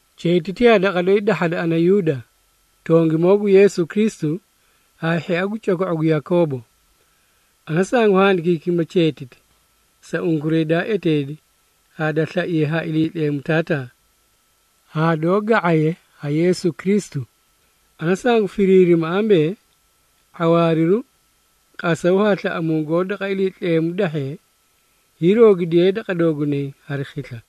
Cheetiti yaa daqa doyi dahhada ana Yuuda, tongimoo gu Yeesu Kristu, haa hhia gu coko⁄u gu Yakoobo. Ana sangu handikiikima cheetiti, sa unkuray daa eteedi haa da slaiye ha Iliitleemu Taataa, haa doó ga⁄aye ha Yeesu Kristu. Ana sangu firiirima ambee, ⁄awaariru, qasaw haa slaꞌamuu goó daqa Iliitleemu dahhee, hiiroogidiye daqa doogunay hari khisla.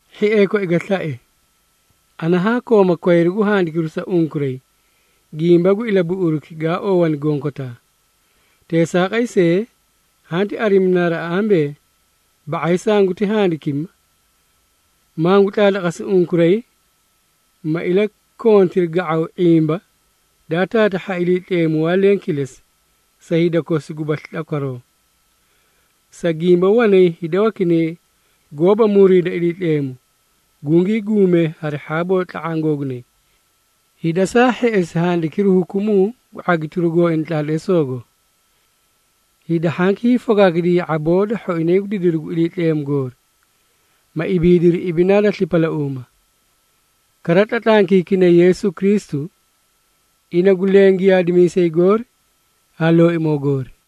Hhiee koi ga slae, ana haa kooma kwayru gu handikiru sa unkuray, gimba gu ilabuꞌuruki gaa oowani gonkotaa. Teesaaqay see, hanti arimi naraꞌa ambee, ba⁄ay sanguti handikima, mangu tlaatlaqasi unkuray, ma ilakontiri ga⁄aw ⁄imba daa taatahhi ha Iliitleemu waa leẽ kilesi, sa hida kosi gubasli tlakwaroo. Sa gimba, wanay hida wakinay goóba muriida Iliitleemu, gungii guumee hari hhaaboo tla⁄aã googunay, hida saa hheꞌesi handikiru hukumuu gu ⁄agitiru gooina tlaatleesoogo. Hida hhanki hiifokaakidiyay ya⁄aboo da hhoinay gu didiru gu Iliitleemu goori, ma ibiidiri ibidinaa da slipalauuma. Kara tlatlankiikinay Yeesu Kristu, ina gu leẽ Giyaadimiisay goori haa Looimoo goori.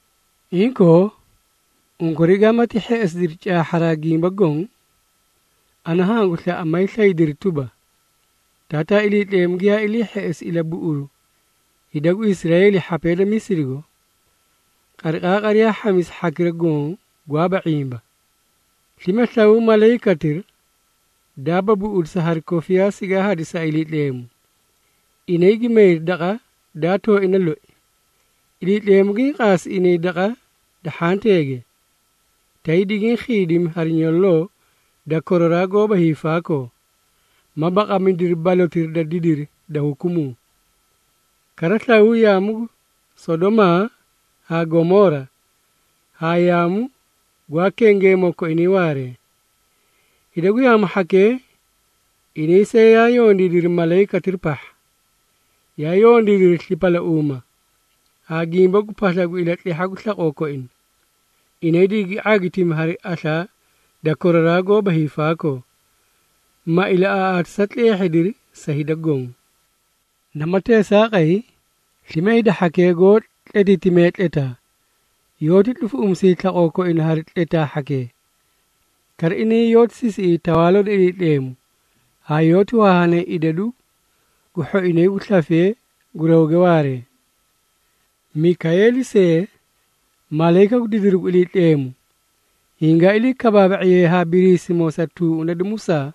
Inkoo, unkuray gaamati hheꞌesidiri caahharaa gimbaki goõ, ana hangu slaꞌa maay slaydiri tuba, Taataa Iliitleemu giyaa ilii hheꞌesi ilabuꞌuru hida gu Israeeli hhapee da Misirigo, qariqaaqari yaa hhamisi hhakira goõ gwaaba ⁄imba. Slime, slawaw malayikatira, daaba buꞌudisa hari kofiyaa sigaa hadisi ha Iliitleemu, inay gi mayri daqa daa tooina loi. Iliitleemu giĩ qaasi inay daqa da hhanteege, tay digiĩ khiidimi hari nyololoo da koraraa goóba hiifaakoo, ma baqamidiri balotira da didiri da hukumuu. Kara, slawaw yaamu gu Sodomaa haa Gomoora, haa yaamu gwaa kengeemoo koinay waaree. Hida gu yaamu hhakee, inay see, yaa yondiidiri malayikatira pahha, yaa yondiidiri slipalauuma, haa gimba gu pasla gu ilatlehha gu slaqoo koina. Inay digigi ⁄agitimi hari aslaa da koraraa goóba hiifaakoo, ma ilaꞌaaꞌaatisa tleehhidiri sa hida goõ. Namati teesaaqay, slime hida hhakee goó tletiitimee tletaa, yoóti tlufuꞌumisiyay slaqoo koina hari tletaa hhakee. Kara, inay yoóti sisiꞌiyay Tawaaloo da Iliitleemu, haa yoóti wahaahanay idadu gu hhoinay gu slafee gu rawge waaree. Mikayeeli see, malayika gu didiru gu Iliitleemu, hingaa ilii kabaaba⁄iyee haa Biriisimoo sa tuuꞌuna da Musaa,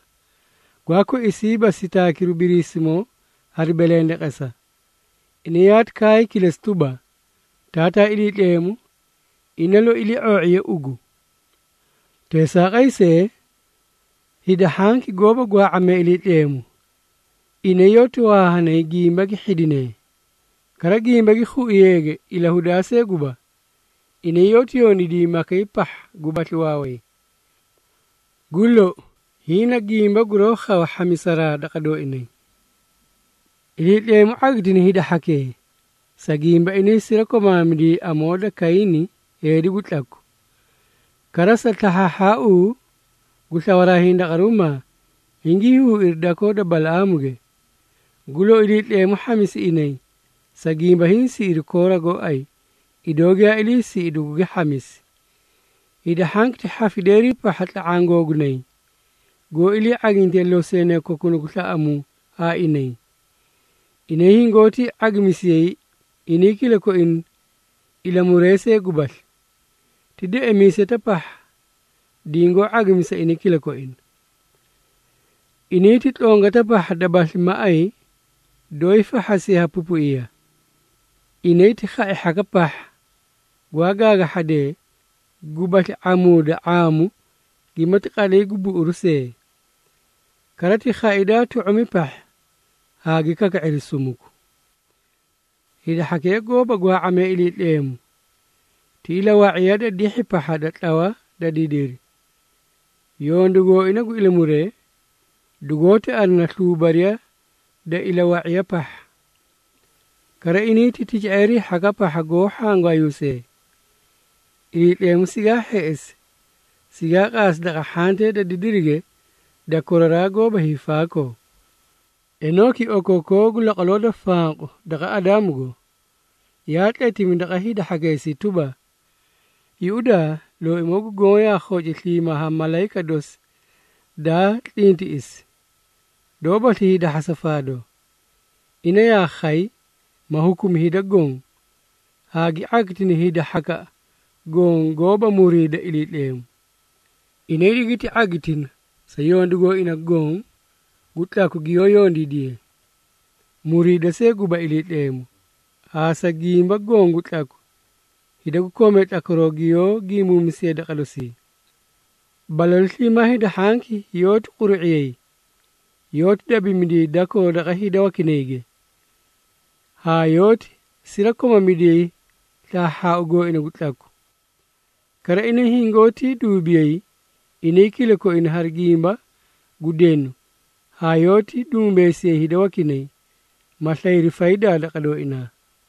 gwaa koisiiba sitaakiru Biriisimoo hari belendeqesa. Ina yaati kaay kilesi tuba, “Taataa Iliitleemu, ina loi ilii⁄oo⁄iye ugu!” Teesaaqay see, hida hhanki goóba gwaa⁄amee Iliitleemu, inay yoóti wahaahanay gimba gi hhidinee. Kara, gimba gi khuiyeege ilahudaa see guba, inay yoóti yondiidiyay makay pahha gubasli waaway. Gu lou, hiĩ na gimba guroó khawa hhamisaraa daqa dooinay. Iliitleemu ⁄agitina hida hhakee, sa gimba inay sirakomaamidiyay amoo da Kayiini heedi gu tlaku. Kara, sa slahhaahhaau gu slawaraa hindaqaruumaa, hingii huuiri dakoo da Balaꞌaamuge. Gu lou, Iliitleemu hhamisi inay, sa gimba hiĩ siꞌiri Koora gooay, idoo giyaa iliisiꞌi dugugi hhamisi. Hida hhanki ti hhafideerii pahha tla⁄aã googunay, goó ilii ⁄agintee loseenoo kokunay gu slaꞌamuu haa inay. Inay hingoóti ⁄agimisiyay inay kilakoina ilamuree see gubasli, ti deꞌemiisetaꞌa pahha dingoó ⁄agimisa inay kilakoina. Inay ti tlongataꞌa pahha dabasli maꞌay, doóyii fahhasiye ha pupuiya. Inay ti khai hhakaꞌa pahha gwaa gaagahhadee, gubasli ⁄aamuuda ⁄aamu gimati qatlay gu buꞌuuꞌuru see. Kara ti khai daa tu⁄umi pahha haa gi kaka⁄iri sumuku. Hida hhakee goóba gwaa⁄amee Iliitleemu, ti ilawa⁄iya da dihhi pahha da tlawa da didiri, yondu gooina gu ilamuree, dugoóti arina sluubariya da ilawa⁄iya pahha. Kara, inay ti tica⁄eerii hhakaꞌa pahha goó hhangwaayuusee. Iliitleemu sigaa hheꞌesi, sigaa qaasi daqa hhantee da didirige da koraraa goóba hiifaakoo. Enooki, okookoo gu laqwaloo da fanqu daqa Adaamugo, yaa tletimi daqa hida hhakeesii tuba, “Yuꞌudaa, Looimoo gu Goõ yaa khoci sliimaa haa malayika dosi daa tlintiꞌisi, doóbasli hiidahhasa faadoo. Ina yaa khay, ma hukumi hida goõ, haa gi ⁄agitina hida hhakaꞌa goõ, goóba muriida Iliitleemu. Inay digiti ⁄agitina, sa yondu gooina goõ gu tlaku giyoó yondiidiyee, muriida see guba Iliitleemu, haa sa gimba goõ gu tlaku, hida gu koomee tlakwaroo giyoó gimbuumisiyee daqa dosii.” Balalu sliimaa hida hhanki yoóti quru⁄iyay, yoóti dabimidiyay dakoo daqa hida wakinayge, haa yoóti sirakomamidiyay slahhaahhaau gooina gu tlaku. Kara, inay hingoótii duubiyay inay kilakoina hari gimba gu denu, haa yoóti dumbeesiyay hida wakinay, ma slayri faydaa daqa dooinaa.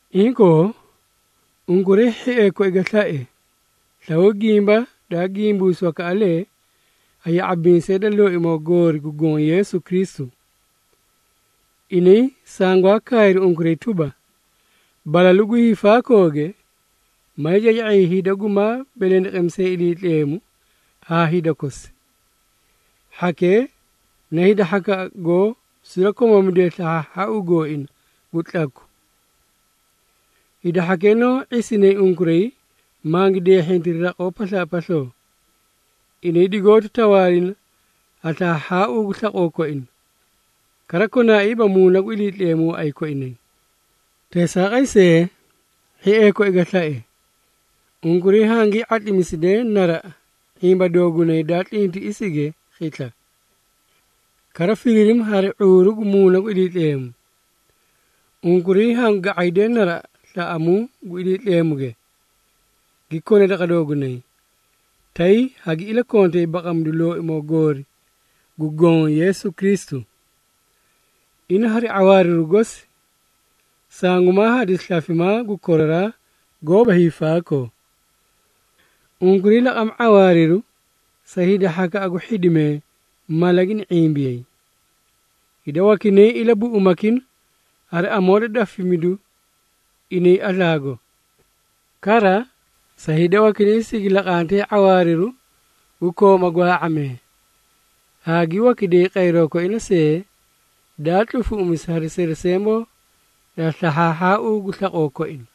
Inkoo, unkuray hhiee koi ga slae, slawaw gimba daa gimbuusi wakaꞌalee ha ya⁄abimiisee da Looimoo goori gu Goõ Yeesu Kristu. Inay sangwaa kaayri unkuray tuba, “Balalu gu hiifaakooge, maay caca⁄iyay hida gumaa belendeqemisee Iliitleemu haa hida kosi. Hhakee na hida hhakaꞌa goó sirakomamidee slahhaahhaau gooina gu tlaku.” Hida hhakee noó ⁄isinay unkuray mangi deehhiihhintiri raqoo paslaapasloo. Inay digoóti tawaalina ha slahhaahhaau gu slaqoo koina, kara konaaiiba Muuna gu Iliitleemu waꞌay koinay. Teesaaqay see, hhiee koi ga slae, unkuray hangii ⁄atlimisidee naraꞌa ⁄imba doogunay daa tlintiꞌisige khisla. Kara, firiirima hari ⁄uuru gu Muuna gu Iliitleemu. Unkuray hangu ga⁄aydee naraꞌa slaꞌamuu gu Iliitleemuge, gi kone daqa doogunay, tay hagi ilakontay baqamidu Looimoo goori gu Goõ Yeesu Kristu. Ina hari ⁄awaariru gosi, sangumaa hadisi slafimaa gu koraraa goóba hiifaakoo. Unkuray laqama ⁄awaariru sa hida hhakaꞌa gu hhidimee mala gini ⁄imbiyay. Hida wakinay ilabuꞌumakina hari amoo da dafimidu inay aslaago. Kara, sa hida wakinay sigi laqantee ⁄awaariru gu kooma gwaa⁄amee, haa gi wakiday qayroo koina see, daa tlufuꞌumisi hari seresemboo da slahhaahhaau gu slaqoo koina.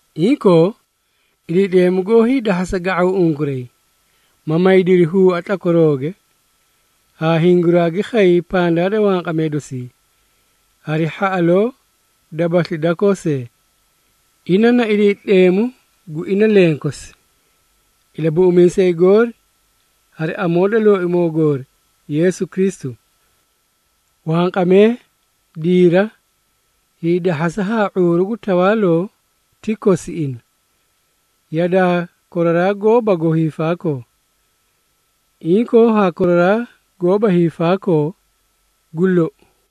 Inkoo, Iliitleemu goó hiidahhasa ga⁄aw unkuray, ma maydiri huua tlakwarooge, haa hinguraagi khay pandaa da wanqamee dosii, hari hhaꞌaloo gubasli dakoo see. Ina na Iliitleemu gu ina lenkosi, Ilabuꞌumiisay goori hari amoo da Looimoo goori, Yeesu Kristu. Wanqamee, diira, hiidahhasa haa ⁄uuru gu tawaaloo ti kosi ina, yadaa koraraa goóbago hiifaakoo, inkoo haa koraraa goóba hiifaakoo! Gu lou.